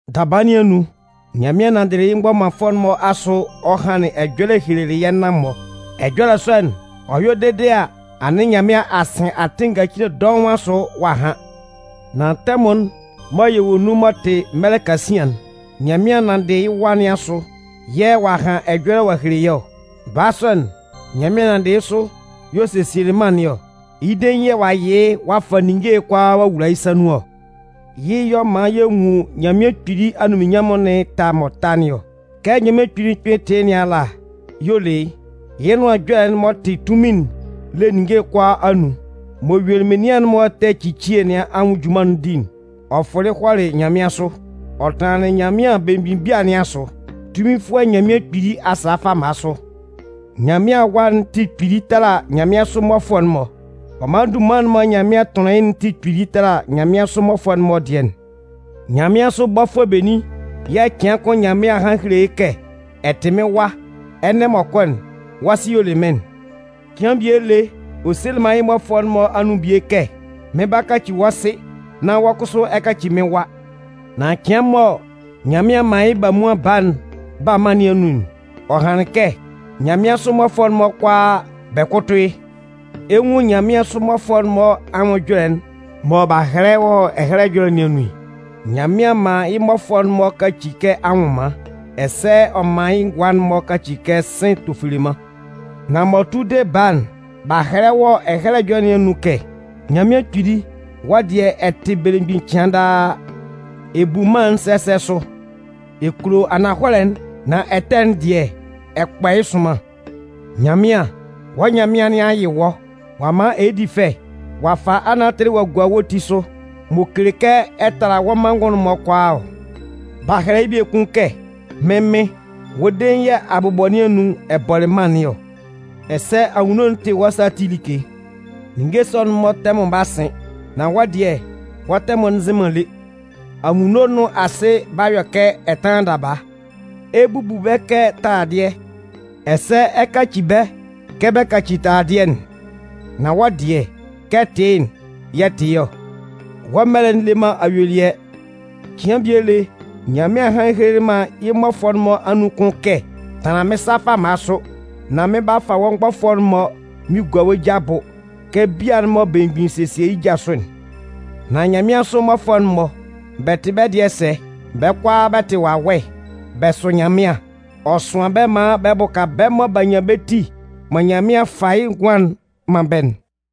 Daba nɩn anun, Nyanmɩan nanndɩlɩ yɩ́ mgbɔmanfʋɛ'n-mɔ asʋ ɔ hanlɩn ɛjɔlɛ ɔ helelɩ yɛ́ nan-mɔ. Ɛjɔlɛ sɔ'n, ɔ yɔ dede a, anɩn Nyanmɩan a sɩn atɩn ngacile dɔʋn asʋ ɔ'a han. Nan tɛmʋn'n mɔ yɛ wɔ nun m'ɔ tɩ mɛlɛ kasian'n, Nyanmɩan nanndɩ yɩ́ Wa nɩn asʋ yɛ̂ ɔ'a han ɛjɔlɛ ɔ'a hele yɛ́ ɔ. Baa sɔ'n, Nyanmɩan nanndɩ yɩ́ sʋ y'ɔ sesielɩ mân nɩn ɔ. Yɩ́ dein yɛ̂ ɔ'a yɩ yɩ́ ɔ'a fa ninnge kʋalaa ɔ'a wula yɩ́ sa nun ɔ. Yɩ́ y'ɔ man yɛ nwun Nyanmɩan Kpili anunminnyanmʋn nɩn ɛta m'ɔ ta nɩn ɔ. Kɛ Nyanmɩan Kpili'n kpɩn tɩ yɩ́ nɩn ala kpɛ y'ɔ le yɩ́. Yɩ́ Nʋan Ɛjɔlɛ'n m'ɔ tɩ tunmin'n le ninnge'n kʋalaa anun. M'ɔ yuelɩ menian'n-mɔ ɛtɛ ecicie nɩn anwʋn junman'n di'n, ɔ fʋlɩ hɔlɩ nyanmɩansʋ. Ɔ hɔlɩ tanlanlɩn anunminnyanmʋn belemgbin bia nɩn asʋ Tunminfʋɛ Nyanmɩan Kpili asa fama sʋ. Nyanmɩan Awa'n tɩ kpili tala nyanmɩansʋ mmɔfʋɛ'n-mɔ. Ɔ man dunman'n mɔ Nyanmɩan tʋnlɩn yɩ́'n tɩ kpili tala nyanmɩansʋ mmɔfʋɛ'n-mɔ dɩɛ'n. Nyanmɩansʋ bɔfʋɛ benin yɛ̂ cɩan kʋn Nyanmɩan a han a hele yɩ́ kɛ: Ɛ tɩ mɩ́n Wa, ɛnɛ m'ɔ kɔ'n, wɔ́ Sɩ y'ɔ le mɩ́n'n? Cɩan bie lé, ɔ selɩ man yɩ́ mmɔfʋɛ'n-mɔ anun bie kɛ: Mɩn 'ba kaci wɔ́ Sɩ, nán wɔ́ kʋsʋ ɛ 'kaci mɩ́n Wa. Nan cɩan mɔ Nyanmɩan 'man yɩ́ Bamuan Baa'n ba mân nɩn anun'n, ɔ hanlɩn kɛ: Nyanmɩansʋ mmɔfʋɛ'n-mɔ kʋalaa, bɛ kʋ́tʋ yɩ́. Ɛ 'nwun nyanmɩansʋ mmɔfʋɛ'n-mɔ anwʋn ɛjɔlɛ'n mɔ b'a hɛlɛ wɔ Ɛhɛlɛ Ɛjɔlɛ nɩn anun'n: Nyanmɩan man yɩ́ mmɔfʋɛ'n-mɔ kaci kɛ anwʋnman, ɛsɛ ɔ man yɩ́ ngʋa'n-mɔ kaci kɛ sɩ̂n tofeleman. Nan m'ɔ tʋ de Baa'n, b'a hɛlɛ wɔ Ɛhɛlɛ Ɛjɔlɛ nɩn anun kɛ: Nyanmɩan Kpili, wɔ́ dɩɛ ɛ tɩ belemgbin cɩan daa. Ɛ bu mân'n sɛsɛ sʋ. Ɛ kulo ananhɔlɛ'n, nan ɛtɛ'n dɩɛ, ɛ kpɔ yɩ́ sʋnman. Nyanmɩan, wɔ́ Nyanmɩan nɩn a yɩ wɔ́, ɔ'a man ɛ di fɛ, ɔ'a fa anatɩlɩ ɔ'a gua wɔ́ ti sʋ m'ɔ kele kɛ ɛ tala wɔ́ manngʋn'n-mɔ kʋalaa ɔ. B'a hɛlɛ yɩ́ biekun kɛ: Mɩ́n Mɩn, wɔ́ dein yɛ̂ abʋbɔ nɩn anun ɛ bɔlɩ mân nɩn ɔ. Ɛsɛ anwunno'n tɩ wɔ́ sa ati like. Ninnge sɔ'n-mɔ tɛmʋn 'ba sɩn nan wɔ́ dɩɛ, wɔ́ tɛmʋn'n nzɩn man lé. Anwunno nʋn asɩ 'ba yɔ kɛ ɛtanlan daba. Ɛ 'bubu bɛ́ kɛ taladɩɛ. Ɛsɛ ɛ 'kaci bɛ́ kɛ bɛ kaci taladɩɛ'n. Nan wɔ́ dɩɛ, kɛ ɛ tɩ yɩ́'n yɛ̂ ɛ tɩ ɔ. Wɔ́ mɛlɛ'n le man ayuelɩɛ. Cɩan bie lé, Nyanmɩan hanlɩn helelɩ man yɩ́ mmɔfʋɛ'n-mɔ anun kʋn kɛ: Tanlan mɩ́n sa fama sʋ nán mɩn 'ba fa wɔ́ mgbɔfʋɛ'n-mɔ mɩn gua wɔ́ ja abʋ kɛ bia'n mɔ belemgbin sesie yɩ́ ja sʋ'n. Nan nyanmɩansʋ mmɔfʋɛ'n-mɔ, bɛ tɩ bɛ́ dɩɛ sɛ? Bɛ́ kʋalaa, bɛ tɩ wawɛ. Bɛ sʋ Nyanmɩan. Ɔ sʋan bɛ́ maan bɛ bʋka bɛ́ mɔ b'a nyan bɛ́ ti mɔ Nyanmɩan 'fa yɩ́ ngʋan'n man bɛ́'n.